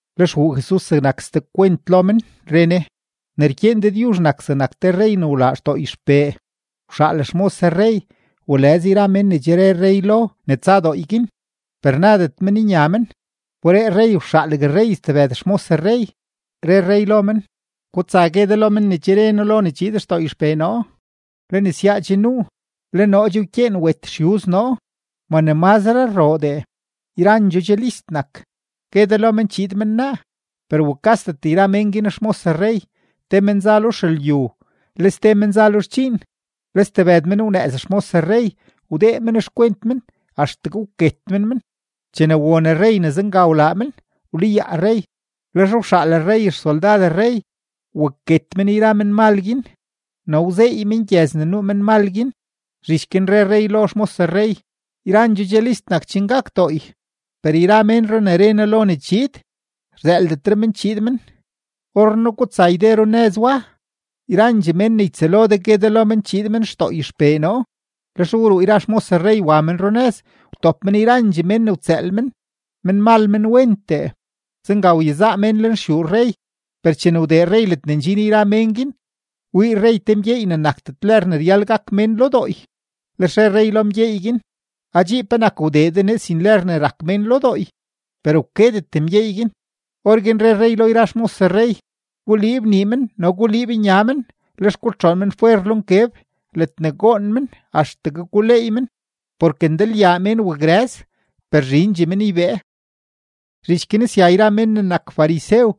Lex wuu Jesus zegnak ste kwent lo men, re Ne: ―Ne rkyeen Dëdyuzh nak zegnak te rrey ne wlaa xdooy xpee. Wxaal xmos rrey walëz yra men ne che re rrey lo ne tsa dooy guin, per nadet men nya men. Wberee rrey wxaalgue stebëd xmos rrey, re rrey lo men: “Gutsa gue de lo men ne che re noo lo ne chiid xdooy xpee noo, le nesyaa che nuu, le noo che wkyeen wet xyuz noo, ma ne mazre rroodee, yrandxoo che list nak; gue de lo men chiid men naa.” Per wukasdet yra mén guin xmos rrey. Te men za lo xelyu, le ste men za lo xdxiin, le stebëd men wnëëz xmos rrey, wdee men xkwent men axtegue wket men men. Chene won rrey ne zenga wlaa men, wlayaa rrey. Lex wxaal rrey xsoldad rrey waket men yra menmal guin no wzeey men gyëz ne nuu menmal guin. Zhich guin re rrey lo xmos rrey: “Yrandxoo che list nak chen gak dooy, per yra ménro ne re noo lo ne chiid, rzëëldetre men chiid men. Orrenaa gutsa yde runëzyu wa, yrandxee mén ne ytsëël de gue de lo men chiid men xdooy xpee noo.” Lex wruu yra xmos rrey wa men runëz, wtop men yrandxee mén ne wtsëël men, menmal menwentee; zenga wyezaa mén lenxyuu rrey. ’Per chene wdee rrey ledne ndxin yra mén guin, wii rrey te mgyeey ne nakdet lër ne ryal gak mén lo dooy. Lex re rrey lo mgyeey guin: “Adxii, ¿penak wdee de nee sin lër ne rak mén lo dooy?” Per wkedet mgyeey guin. Orguin re rrey lo yra xmos rrey: “Guliib nii men no guliib nya men, lex gutxoon men fwer lo nkeb ledne goon men axtegue guleey men.” Porke ndalyaa mén wakrëz, per zhindxee men ybee. Zhich guin sya yra men ne nak farisew,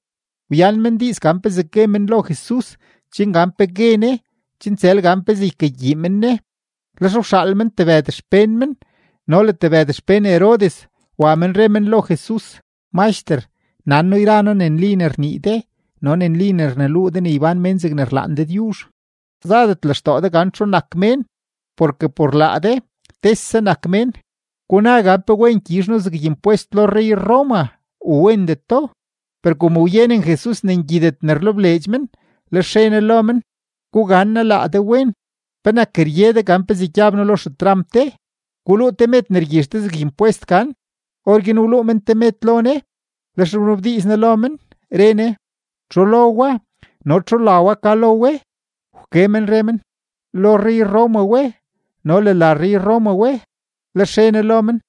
wyan men diiz gan pezee gue men lo Jesus chen gan pe gue Ne chen tsël gan pezee ykagyii men Ne. Lex wxaal men tebëd xpén men no le tebëd xpén Herodes wa men re men lo Jesus: ―Maxter, nan noo yra noo ne nli ne rnii de no ne nli ne rneluu de ne ybán mén zegne rlaan Dëdyuzh. Zadet lextoo de gan txu nak mén porke por laa de tese nak mén. Guna gan ¿pe wen gyizh noo zeg impwest lo rrey-Roma u wendeto? Per kom wyenen Jesus ne ngyidet ne rlebleedx men, lex re Ne lo men: ―Gugannaa laa de wen, ¿penak rye de gan pezee gyab noo lo xetramp de? Guluu te med ne rgyizh de zeg impwest gan. Orguin wluu men te med lo Ne. Lex wnabdiiz Ne lo men, re Ne: ―¿Txu lo wa no txu la wa ka lo we? Wke men re men: ―Lo rrey-Roma we no le la rrey-Roma we. Lex re Ne lo men: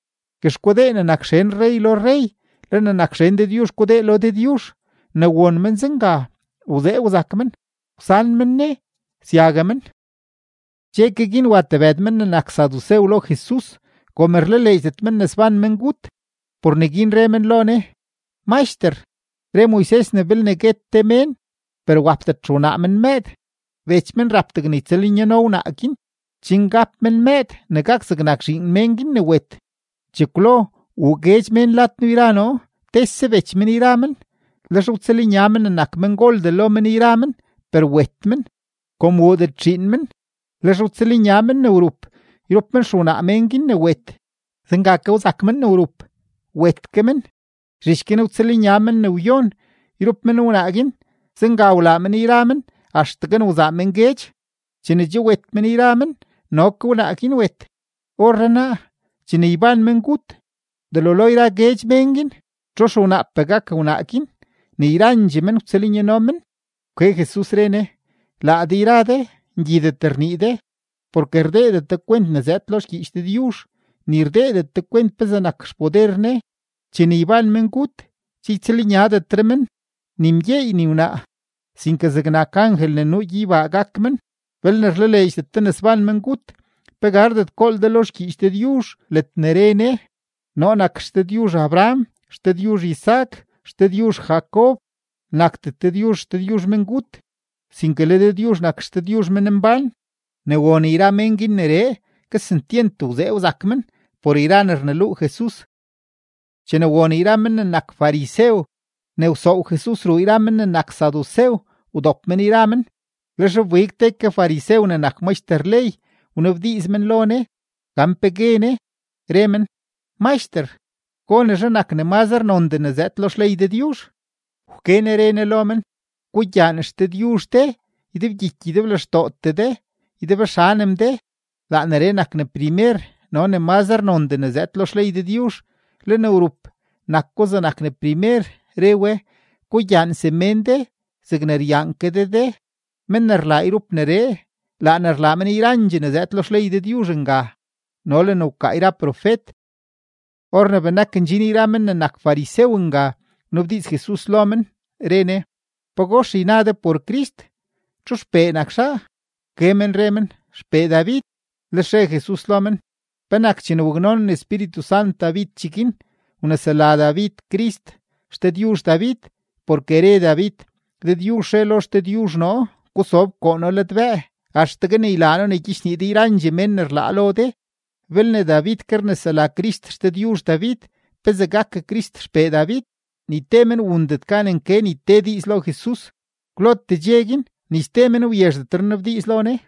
―Guex gudee ne nak xen rrey lo rrey, le ne nak xen Dëdyuzh gudee lo Dëdyuzh. Ne won men zenga, wzee wzak men; wsan men Ne, syague men. Dxe ke guin, wa tebëd men ne nak sadusew lo Jesus. Kom rlaleedxdet men ne sban mengut, por neguin re men lo Ne: ―Maxter, re Moises ne belne guet te mén, per wapdet xewnaa men mëëd, bech men rap degne ytsëlnyano wnaa guin, chen gap men mëëd ne gak zegnak zhiin mén guin ne wet. Chekwlo wuu guedx mén lad noo yra noo, tese bech men yra men; lex wtsëlnya men ne nak mengoldee lo men yra men, per wet men. Kom wuudet zhiin men, lex wtsëlnya men ne wrup yrup men xewnaa mén guin ne wet. Zenga ke wzak men ne wrup, wet ke men; zhich guin wtsëlnya men ne wyon yrup men wnaa guin; zenga wlaa men yra men axtegue ne wzaa men guedx. Chene che wet men yra men, no ke wnaa guin wet. Orrenaa, chene yban mengut, delo yra guedx mén guin, ¿txu xewnaapee gak wnaa guin ne yrandxee men wtsëlnyano men? Wke Jesus, re Ne: ―Laa de yra de ngyidet ne rnii de, porke rdeedet de kwent ne zëëd lo xgyiich Dëdyuzh, ni rdeedet de kwent pezee nak xpoder Ne. Chene yban mengut, che ytsëlnyadetre men, ni mgyeey ni wnaa, sinke zegnak angel ne nuu gyeybaa gak men. Belne rlaleedxdet de ne sban mengut, ¿pe gardet gool de lo xgyiich Dëdyuzh ledne re Ne: “Noo nak XDëdyuzh Abraham, XDëdyuzh Isaac, XDëdyuzh Jacob”? Nakdet Dëdyuzh XDëdyuzh mengut, sinke le Dëdyuzh nak XDëdyuzh menmbán. Ne won yra men guin neree, kesentyent wzee wzak men por yra ne rneluu Jesus. Chene won yra men ne nak farisew ne wsoow Jesus ruu yra men ne nak sadusew, wdop men yra men. Lex wbig te ke farisew ne nak maxter ley wnabdiiz men lo Ne gan pe gue Ne, re men: ―Maxter, ¿gonezhe nak ne mazre nondee ne zëëd lo xley Dëdyuzh? Wke Ne re Ne lo men: ―“Gugyaan XDëdyuzh de ydebgyiky ydeblextootee de, ydebxanem de.” Laa neree nak ne primer no ne mazre nondee ne zëëd lo xley Dëdyuzh. Le ne wrup nak ko zegnak ne primer, re we: “Gugyaan semén de zegne ryaan ke de de.” Mén ne rlaa yrup neree, laa ne rlaa men yrandxee ne zëëd lo xley Dëdyuzh nga no le ne wkaa yra profet. Or ne benak ndxin yra men ne nak farisew nga, wnabdiiz Jesus lo men, re Ne: ―¿Pagox yna de por Crist? ¿Txu xpee nak zhaa? Wke men re men: ―Xpee David. Lex re Jesus lo men: ―¿Penak chene waknonen Espíritu Sant David cheguin, wnesela David Crist XDëdyuzh David? Porke re David: Dëdyuzh re lo XDëdyuzh noo: “Gusob koo noo ladbëë axtegue ne ylaa noo ne gyichnii de yrandxee mén ne rlaa lo de.” Belne David ke rnesela Crist XDëdyuzh David, ¿pezee gak Crist xpee David? Ni te men wundet gan nke ni te diiz lo Jesus; kwlotee dxe guin ni ste men wyezhdetre nnabdiiz lo Ne.